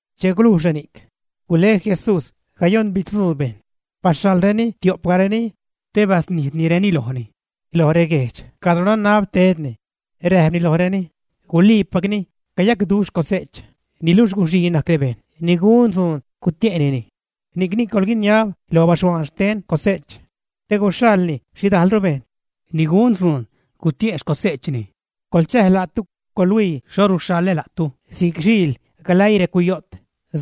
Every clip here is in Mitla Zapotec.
Che gulujx reni'c, gule Jesús gayoṉbitzuu bejṉ, baxhaḻnireni tio'pgajreni te basnijdnireni lojni loj reguejdx cadro nanab tedni. Räjpni lojreni: ―Guliipacni, cayacduxh cose'ch, niluxh guxii najc rebejṉ ni gun dzuun gutie'nini. Ni'cni coḻguiniab lo baxhuaan xten cose'ch te guxhaḻni xhidajlru bejṉ ni gun dzuun gutie' xcose'chni. Coḻchäj la'tu; coḻhuii xho ruxhaḻä la'tu si'c xiil galäii recuyo't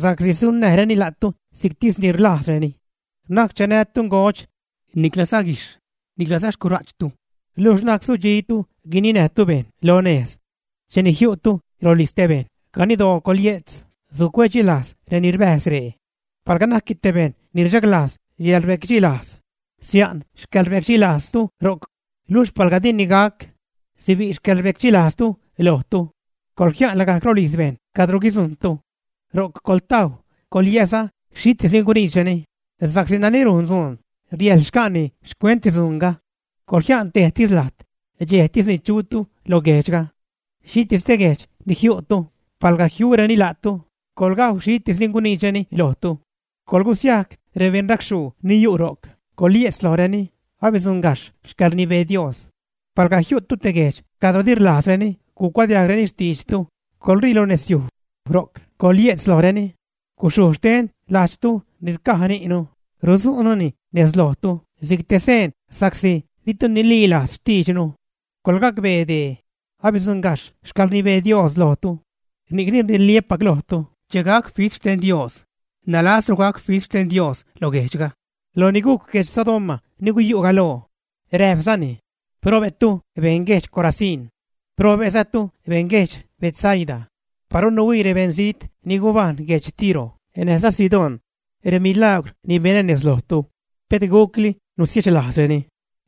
sa'csi sunnäjreni la'tu si'ctisni rlajzreni. Na'c chanätu ngodx, niclaza guijxh, niclaza xcura'chtu, luxh na'c sudxitu guininäjtu bejṉ lo nejz. Cheni jiu'tu rolijz te bejṉ, ganiddoo coḻye'tz: “Sucuedxilajz reni rbäjz ree.” Palga najcni te bejṉ ni rdxaglajz yäḻrbecdxilajz sia'n xcäḻrbecdxilajztu ro'c, luxh palga dini gac, sibi' xcäḻrbecdxilajztu lojtu. Coḻjia'n lagajc rolijz bejṉ cadro guidzujṉtu. Ro'c coḻtajw, coḻyä'za xhitis ni guniidxreni, sa'csi nani rujn dzuun, riäjḻ xca'ni xcuent dzuunga. Coḻjia'n tejtis lajt dxejtis ni chutu lo guejdxga. Xhitis te guejdx ni jiu'tu, palga jiureni la'tu, coḻgajw xhitis ni guniidxreni lojtu. Coḻgusiajc rebeṉracxhuu ni yu' ro'c, coḻye'tz lojreni: “Abidzujṉgajxh xcäḻrnibee Dios.” Palga jiu'tu te guejdx cadro di rlajzreni gucuadiajgreni xtiidxtu, coḻṟii lo nezyuj, ro'c coḻye'tz lojreni: “Guxhuj xten lajdxtu ni rcaj ni'nu, rudzu'nuni nez lojtu si'c te seen sa'csi ditu nililajz xtiidxnu. Coḻgacbee dee, abidzuṉgajxh xcäḻrnibee Dios lojtu.” Ni'cni rniliä́pac lojtu, che gac fis xten Dios, nalasru gac fis xten Dios lo guejdxga loj ni gujc guedx Sodoma ni guyu' galoo. Räjpzani: ―¡Probe'tu beṉ guedx Corazín! ¡Probe'zatu beṉ guedx Betsaida! Paru nuhuii rebeṉzijt ni gubajṉ guedx Tiro näjza Sidón remilaagwr ni benä nez lojtu, pet gucli nusiechlajzreni,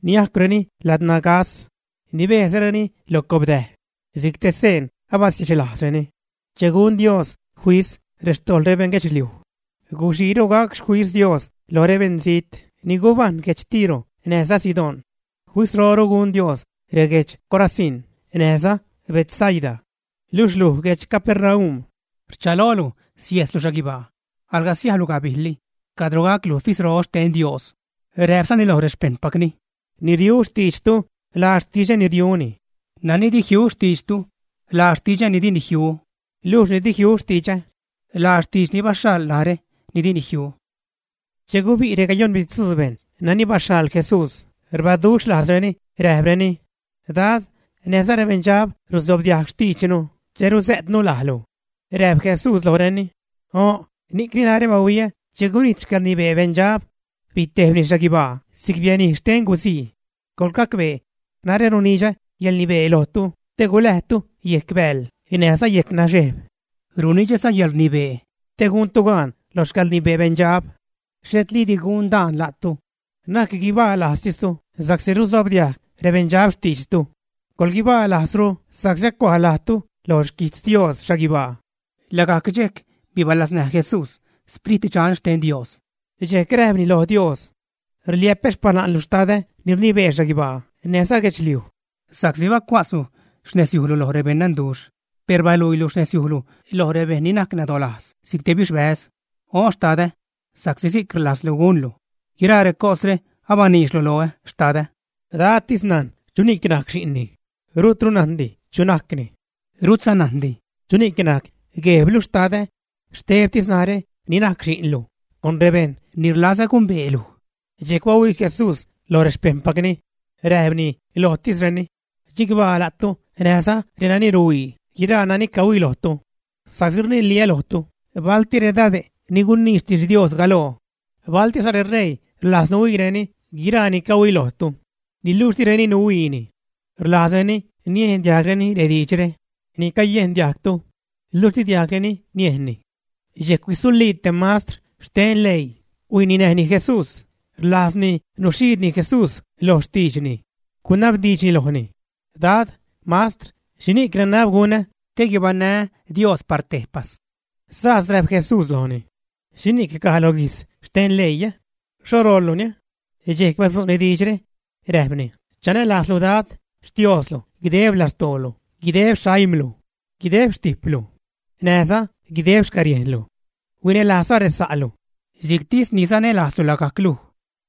niajcwreni ladnagas, nibejzareni lo cobdäj si'c te seen abasiechlajzreni. Che gun Dios fis rextojḻ rebejṉ guedxliuj, guxiiru gac xfis Dios lo rebeṉzijt ni gubajṉ guedx Tiro näjza Sidón. Fisroru gun Dios reguedx Corazín näjza Betsaida. Luxh luj guedx Capernaum, rchalolu siäjslu xhaguibaa, alga siajblu gabijlli, cadro gaclu fisro xten Dios. Rajpzani lo rexpejṉpacni: ―Ni riu xtiidxtu, laa xtidxä ni riuni. Nani di jiu xtiidxtu, laa xtidxä ni dini jiu. Luxh ni di jiu xtidxä, laa xtiidx ni baxhaḻ narä ni dini jiu. Che gubi' regayoṉbitzuu bejṉ nani baxhaḻ Jesús, rbaduxh lajzreni, räjpreni: ―Dad, näjza rebeṉdxab rusobdiajg xtiidxnu che rusä'tnu lajlu. Räjp Jesús lojreni: ―O'n. Ni'cni narä bahuiä che gunijt xcäḻrnibee beṉdxab, bitejbni xhaguibaa si'c bianij xten guzii. Coḻgacbee. Narä runidxä yäḻrnibee lojtu te guläjtu yejc bäḻ näjza yejc naxejb; runidxäza yäḻrnibee te guntu gaan lo xcäḻrnibee beṉdxab. Xhetliidi gun daan la'tu. Na'c guibalajztistu sa'csi rusobdiajg rebeṉdxab xtiidxtu; coḻguibalajzru sa'csi acuaj lajtu lo xquijtz Dios xhaguibaa. Lagajc dxejc bibalaznäj Jesús Sprit Dxan xten Dios, dxejc räjpni lo Dios: ―Rliä'pä xpala'nlu Xtadä ni rnibee xhaguibaa näjza guedxliuj, sa'csi bacua'tzlu xnezyujlu lo rebeṉ nanduxh, per baluiilu xnezyujlu loj rebejṉ ni najc nadolajz si'c te biuxbäz. O'n, Xtadä, sa'csi si'c rlajzlu gunlu. ’Guiraa recosre abaniidxlu loä Xtadä. Dadtis najn chuni'c najc Xi'nni, rutru najndi chu najcni. Rutza najndi chuni'c najc Guejblu Xtadä, xtebtis narä ni najc Xi'nlu, con rebejṉ ni rlazä gumbee luj. Dxejc bahuii Jesús loj rexpejṉpacni, räjpni lojtisreni: ―Chicbaa la'tu näjza renani ruhuii guiraa nani cahuilojtu. Sa'csi rniliä lojtu, balti redade' ni gunii xtidx Dios galoo, baltiza reṟeii rlajz nuhuiireni guiraa ni cahuilojtu, niluxh direni nuhuiini. Rlajzreni niejn diajgreni rediidxre ni cayejn diajgtu, luxh di diajgreni niejnni. Dxejc huisulii te mastr xten leii, huininäjni Jesús, rlajzni nuxhiidni Jesús lo xtiidxni, gunabdiidxni lojni: ―Dad, Mastr, ¿xhini'c nanab gunä te guibaṉnää́ Dios par tejpas? Sas räjp Jesús lojni: ―¿Xhini'c caj lo guijtz xten leii? ¿Xho roḻluni? Dxejc badzu'ni diidxre, räjpni: ―Chanälajzlu Dad, Xtioslu guideb lastoolu, guideb xaimlu, guideb xtijplu, näjza guideb xcäriejnlu. Huinälajzza resa'lu si'ctis ni sanälajzlu lagajc luj.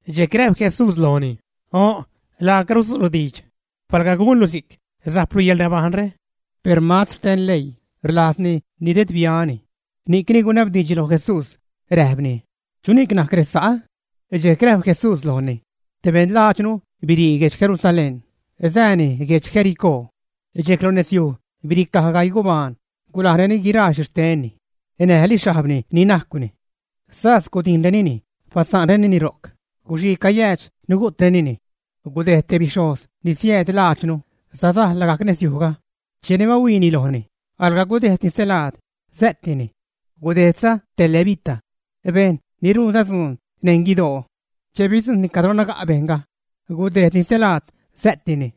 Dxejc räjp Jesús lojni: ―O'n, laaca rudzu'lu diidx. Palga gunlu si'c, sajplu yäḻnabajṉre. Per mastr xten leii, rlajzni nidedbiani ni'cni gunabdiidxni loj Jesús räjpni: ―¿Chuni'c najc resa'ä? Dxejc räjp Jesús lojni: ―Te beṉ laadxnu birii guedx Jerusalén, sääni guedx Jericó. Dxejc lo nezyuj biricaj gaii gubaan, gulajnreni guiraa xhixtenni, näjli xhajbni ni najcwni. Sas gudijnrenini, basa'nrenini ro'c, guxii cayäädx nugu'trenini. Gudejd te bixhojz ni siääd laadxnu, sazaj lagajc nezyujga, cheni bahuiini lojni, alga gudejdni stee laad, sä'tini. Gudejdza te levita, bejṉ ni rujnza dzuun neṉ guidoo. Che bidzujṉni cadro naga' bejṉga, gudejdni stelaad, sä'tini.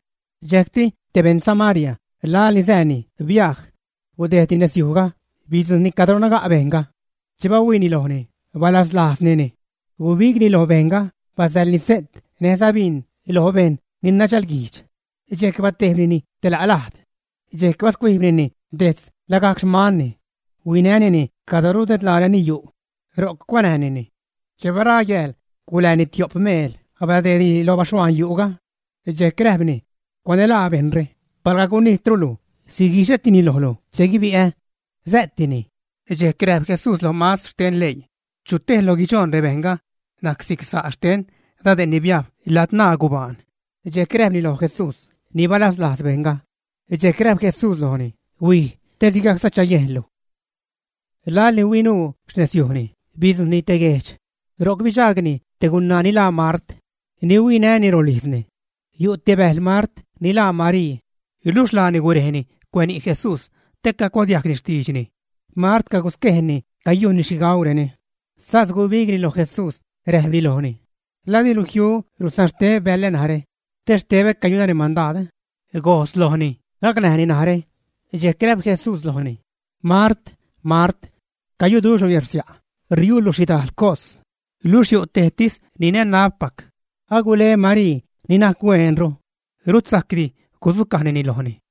Dxejcti te beṉ Samaria, laḻni sääni biaj, gudejdni nezyujga, bidzujṉni cadro naga' bejṉga. Che bahuiini lojni, balaslajznini. Gubigni loj bejṉga, basäḻni se't näjza bin loj bejṉ ni nadxälguijdx, dxejc batejbnini te la' lajd. Dxejc bascuijbnini dejtz lagajc xmanni, huinänini cadro rudedlaareni yu', ro'c cuanäjnini. Che bara yääl, gulääni tio'p meel badeedni lo baxhuaan yu'ga. Dxejc räjpni: “Cuanälaa bejṉre; palga gunijtrulu, siguixätini lojlu che guibi'ä.” Sä'tini. Dxejc räjp Jesús lo mastr xten leii: ―¿Chu tej lo guidxoṉ rebejṉga najc si'c sa' xten dade' ni biajb ladzṉaa gubaan? Dxejc räjpni loj Jesús: ―Ni balaslajz bejṉga. Dxejc räjp Jesús lojni: ―Huij te sigajcza chayejnlu. Laḻni huinuu xnezyujni, bidzujṉni te guejdx. Ro'c bidxaagni te gunaa ni laa Mart ni huinänini rolijzni. Yu' te bäjl Mart ni laa Marii, luxh laani gurejni cuä' ni' Jesús te cacuadiajgni xtiidxni. Mart cagusquejṉni cayujnni xhi gaureni. Sas gubigni loj Jesús, räjpni lojni: ―¿La dilu jiu rusanxteb bälä narä te xtebä cayunä remandaad? ¡Gojs lojni gacnäjni narä! Dxejc räjp Jesús lojni: ―Mart, Mart, cayuduxhlu yärsia', riulu xhidajl cos, luxh yu' tejtis ni nanabpac. Agule Marii ni najc huenru, rut sajcdi gudzucajnini lojni.